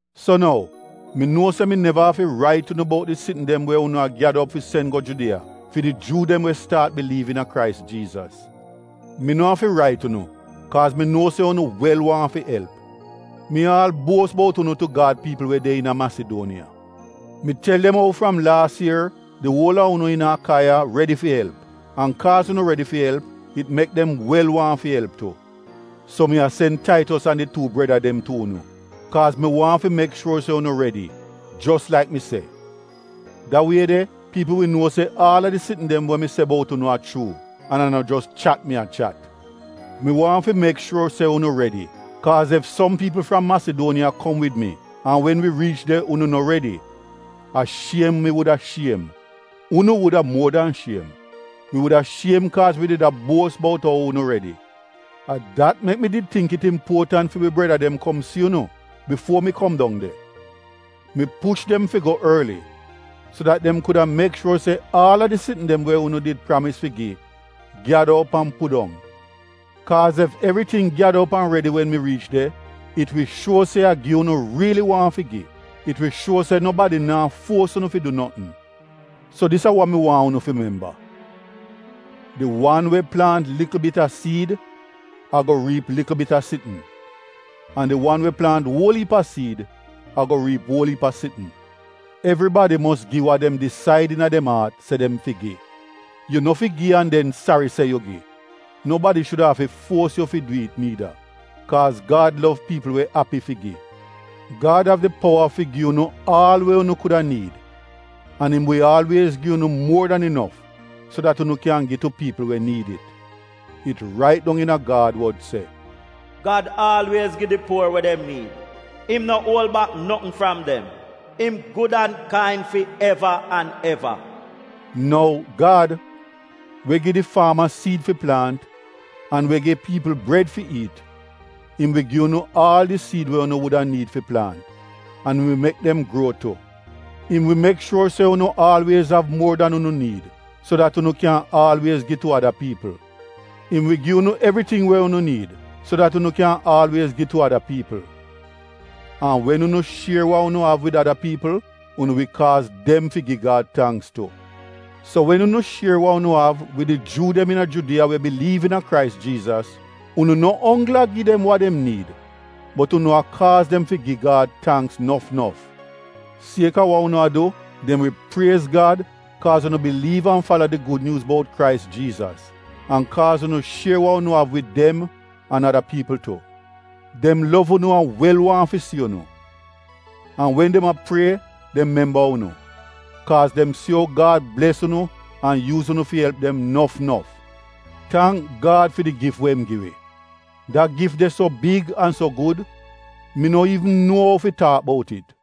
So nou mi nuo se mi neva afi rait unu bout di sitn dem we unu a gyada op fi sen go Judiya fi di Juu dem we staat biliiv iina Krais Jiizas. Mi no afi rait unu kaaz mi nuo se unu wel waahn fi elp. Mi aal buos bout unu tu Gad piipl we de iina Masiduoniya. Mi tel dem ou fram laas ier di uol a unu iina Akaiya redi fi elp an kaaz unu redi fi elp, it mek dem wel waahn fi elp tu. So mi a sen Taitos an di tuu breda dem tu unu kaaz mi waahn fi mek shuor se unu redi, jos laik mi se. Da wie de piipl wi nuo se aal a di sitn dem we mi se bout unu a chuu, an a no jos chat mi a chat. Mi waahn fi mek shuor se unu redi kaaz ef som piipl fram Masiduoniya kom wid mi, an wen wi riich de unu no redi, a shiem mi wuda shiem. (Unu wuda muor dan shiem.) Wi wuda shiem kaaz wi did a buos bout ou unu redi. A dat mek mi did tingk it impuotant fi wi breda dem kom si unu bifuo mi kom dong de. Mi push dem fi go orli so dat dem kuda mek shuor se aal a di sitn dem we unu did pramis fi gi, gyada op an pudong. Kaaz ef evriting gyada op an redi wen mi riich de, it wi shuo se a gi unu riili waahn fi gi; it wi shuo se nobadi naa fuos unu fi du notn. So dis a wa mi waahn unu fi memba: Di wan we plaant likl bit a siid ago riip likl bit a sitn, an di wan we plaant uol iip a siid ago riip uol iip a sitn. Evribadi mos gi wa dem disaid iina dem aat se dem fi gi. Yu no fi gi an den sari se yu gi. Nobadi shuda afi fuos yu fi du it niida kaaz Gad lov piipl we api fi gi. Gad av di powa fi gi unu aal we unu kuda niid an im wi aalwiez gi yu muor dan inof so dat unu kyan gi tu piipl we niid it. It rait dong iina Gad wod se: “Gad aalwiez gi di puor we dem niid, im no uol bak notn fram dem; Im gud an kain fi eva an eva.” Nou, Gad, we gi di faama siid fi plaant an we gi piipl bred fi iit, im wi gi unu aal di siid we unu wuda niid fi plaant an im wi mek dem gruo tu. Im wi mek shuor se unu aalwiez av muor dan unu niid, so dat unu kyan aalwiez gi tu ada piipl. Im wi gi unu evriting we unu niid so dat unu kyan aalwiez gi tu ada piipl. An wen unu shier wa unu av wid ada piipl, unu wi kaaz dem fi gi Gad tangks tu. So wen unu shier wa unu av wid di Juu dem iina Judiya we biliiv iina Krais Jiizas, unu no onggl a gi dem wa dem niid, bot unu a kaaz dem fi gi Gad tangks nof nof. Sieka wa unu a du, dem wi priez Gad kaaz unu biliiv an fala di Gud Nyuuz bout Krais Jiizas an kaaz unu shier wa unu av wid dem an ada piipl tu. Dem lov unu an wel waahn fi si unu. An wen dem a prie dem memba unu, kaaz dem si ou Gad bles unu an yuuz unu fi elp dem nof nof. Tangk Gad fi di gif we im gi wi. Da gif de so big an so gud mi no iivn nuo ou fi taak bout dem.